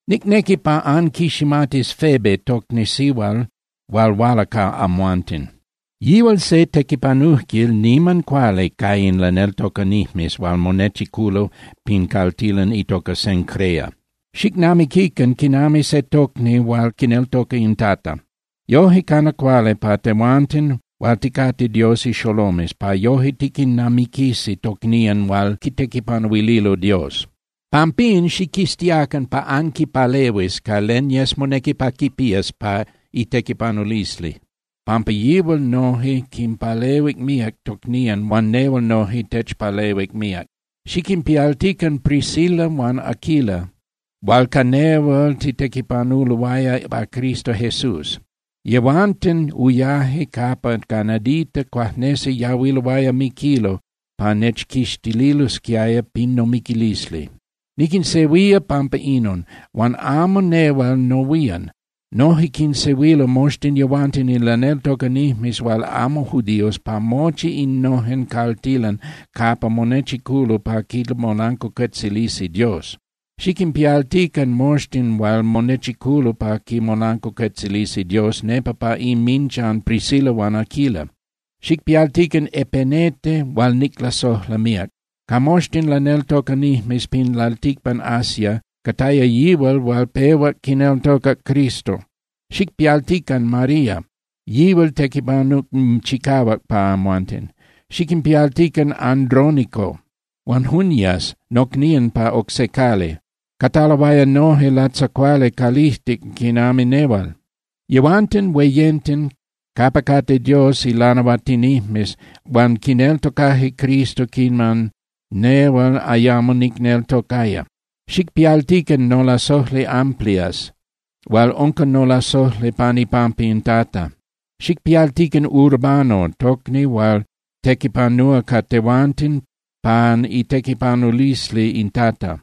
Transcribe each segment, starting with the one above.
Nicnequi pa anquiximatis Febe tocni sihual hual huala ca amhuanten. Yihual se tequipanujquil niman cuali ca in laneltocanijmes hual monechiculo pin caltilan itoca Cencrea. Xicnamiquican quinami se tocni hual quineltoca in Tata. Yoje cana cuali pa tehuanten hual ticate Dios ixolomes pa yoje tiquinnamiquisi tocnían hual quitequipanuililo Dios. Pampín, xiquiztiacan pa anquipalehuis ca len yes monequi pa quipías pa itequipanulisli, pampa yihual noje quinpalehuic míac tocnían huan nehual noje nechpalehuic míac. Xiquinpialtican Priscila huan Aquila hual ca nehual titequipanuloaya pa Cristo Jesús. Yehuanten uyaje capa ca nadita cuajnesi yahuiloaya miquilo pa nechquixtililosquiaya pin nomiquilisli. Niquinsehuía pampa inon, huan amo nehual nohuían. Noje quinsehuilo moxtin yehuanten in laneltocanijmes hual amo judíos pa mochi innojen caltilan capa monechiculo pa quimolancuacuetzilisi Dios. Xiquinpialtican moxtin hual monechiculo pa quimolancuacuetzilisi Dios nepa pa inminchan Priscila huan Aquila. Xicpialtican Epenete hual niclasojla míac. Ca moxtin laneltocanijmes pin lalticpan Asia, cataya yihual hual pehuac quineltocac Cristo. Xicpialtican María, yihual tequipanuc chicahuac ca amhuanten. Xiquinpialtican Andrónico huan Junias nocnían pa oc se cali, cataloaya noje latzacuali calijtic quinami nehual. Yehuanten hueyenten capa cate Dios ilanahuatinijmes huan quineltocaje Cristo quiman nehual ayamo nicneltocaya. Xicpialtican nolasojli Amplias hual unca nolasojli pan ipampa in Tata. Xicpialtican Urbano tocni hual tequipanúa ca tehuanten pan itequipanulisli in Tata.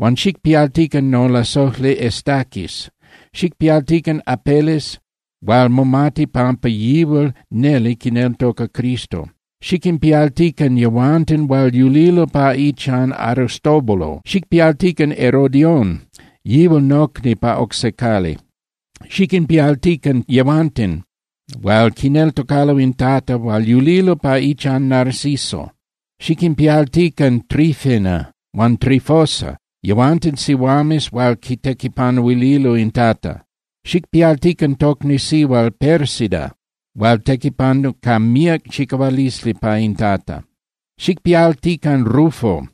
Huan xicpialtican nolasojli Estaquis. Xicpialtican Apeles hual momati pampa yihual neli quineltoca Cristo. Xiquinpialtican yehuanten hual yulilo pa ichan Aristóbulo. Xicpialtican Herodión, yihual nocni pa oc se cali. Xiquinpialtican yehuanten hual quineltocalo in Tata hual yulilo pa ichan Narciso. Xiquinpialtican Trifena huan Trifosa yehuanten sihuames hual quitequipanuililo in Tata. Xicpialtican tocni sihual Pérsida hual tequipanuc ca míac chicahualisli pa in Tata. Xicpialtican Rufo,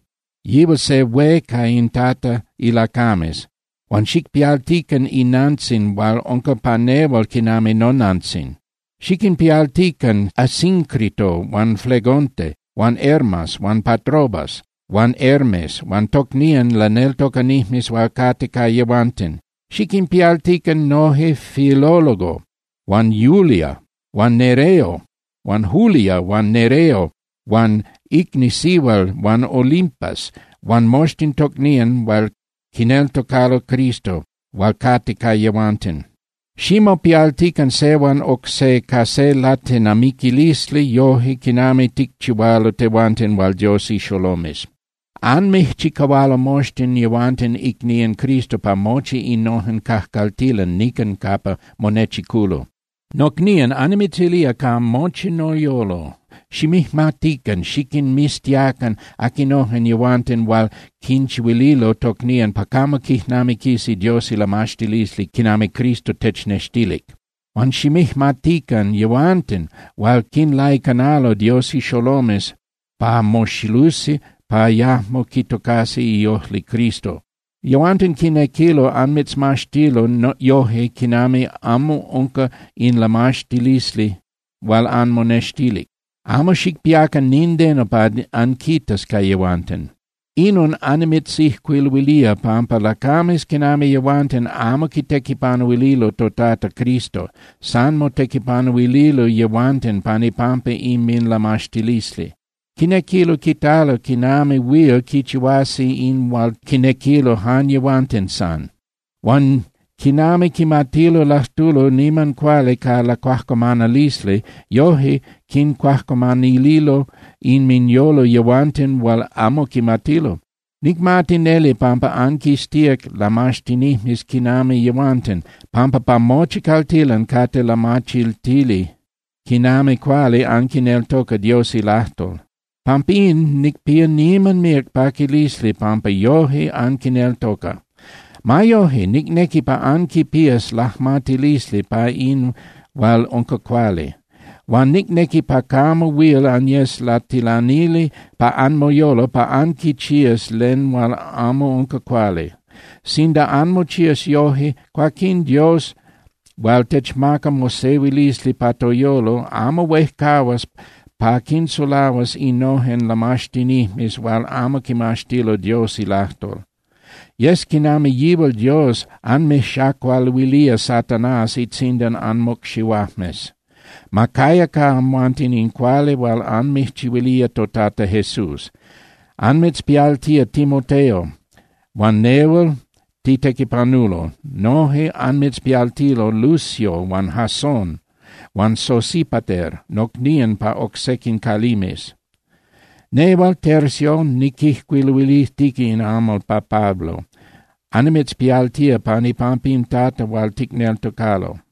yihual se hué ca in Tata ilacames, huan xicpialtican inantzin hual unca pa nehual quinami nonantzin. Xiquinpialtican Asíncrito huan Flegonte huan Hermas huan Patrobas huan Hermes huan tocnían laneltocanijmes hual cate ca yehuanten. Xiquinpialtican noje Filólogo huan Julia huan Nereo huan icni sihual huan Olimpas huan moxtin tocnían hual quineltocalo Cristo, hual cate ca yehuanten. Ximopialtican se huan oc se ca se latenamiquilisli yoje quinami ticchihualo tehuanten hual Dios ixolomes. Anmijchicahualo moxtin yehuanten icnían Cristo pa mochi innojen cajcaltilan nican capa monechiculo. Nocnían, annimitzilía ca mochi noyolo, ximijmatican xiquinmiztiacan aquinojen yehuanten hual quinchihuililo tocnían pa camo quijnamiquisi Dios ilamaxtilisli quinami Cristo technextilic. Huan ximijmatican yehuanten hual quinlaicanalo Dios ixolomes pa moxilusi pa yajmo quitocasi iojli Cristo. Yehuanten quinequilo anmitzmaxtilo yoje quinami amo unca in lamaxtilisli hual anmonextilic. Amo xicpiacan nindeno pa anquitas ca yehuanten. Inon annimitzijcuiluilía, pampa lacames quinami yehuanten amo quitequipanuililo toTata Cristo. San motequipanuililo yehuanten pan ipampa inminlamaxtilisli. Quinequilo quitalo quinami huil quichihuasi in hual quinequilo jan yehuanten san. Huan quinami quimatilo lajtulo niman cuali ca lacuajcuamanalisli, yoje quincuajcuamanililo inminyolo yehuanten hual amo quimatilo. Nicmati neli pampa anquiztíac lamaxtinijmes quinami yehuanten, pampa pa mochi caltilan cate lamachiltili quinami cuali anquineltoca Dios ilajtol. Pampín nicpía niman míac paquilisli pampa yoje anquineltoca. Ma yoje, nicnequi pa anquipías lajmatilisli pa in hual unca cuali. Huan nicnequi pa camo huil anyes latilanili pa anmoyolo pa anquichías len hual amo unca cuali. Sinda anmochías yoje, cuaquín Dios hual techmaca mosehuilisli pa toyolo amo huejcahuas pa quinsulahuas innojen lamaxtinijmes hual amo quimaxtilo Dios ilajtol. Yes quinami yihual Dios anmijxacualuilía Satanás itzindan anmocxihuajmes. Ma caya ca amhuanten in cuali hual anmijchihuilía toTata Jesús. Anmitzpialtía Timoteo, huan nehual titequipanulo, noje anmitzpialtilo Lucio huan Jasón huan Sosípater nocnían pa oc sequin calimes. Nehual, Tercio, niquijcuiluilijtica in amal pa Pablo, annimitzpialtía pan ipampa in Tata hual ticneltocalo.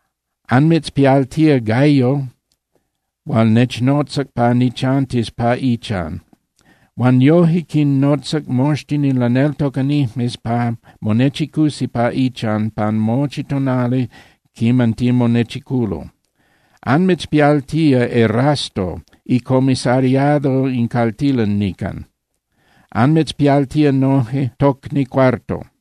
Anmitzpialtía Gayo hual nechnotzac pa nichantis pa ichan, huan noje quinnotzac moxtin in laneltocanijmes pa monechicusi pa ichan pan mochi tonali quiman timonechiculo. Anmitzpialtía Erasto icomisariado in caltilan nican, anmitzpialtía noje tocni Cuarto.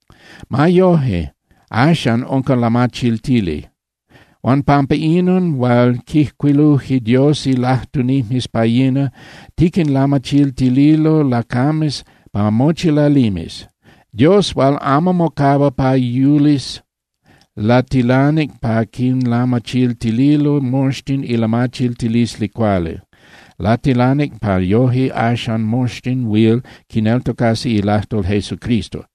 Ma yoje, axan unca lamachiltili. Huan pampa inon hual quijcuiluje Dios ilajtunijmes pa yina, tiquinlamachiltililo lacames pa mochi lalimes. Dios hual amo mocahua pa yulis latilanic pa quinlamachiltililo moxtin ilamachiltilisli cuali. Latilanic pa yoje axan moxtin huil quineltocasi ilajtol Jesucristo.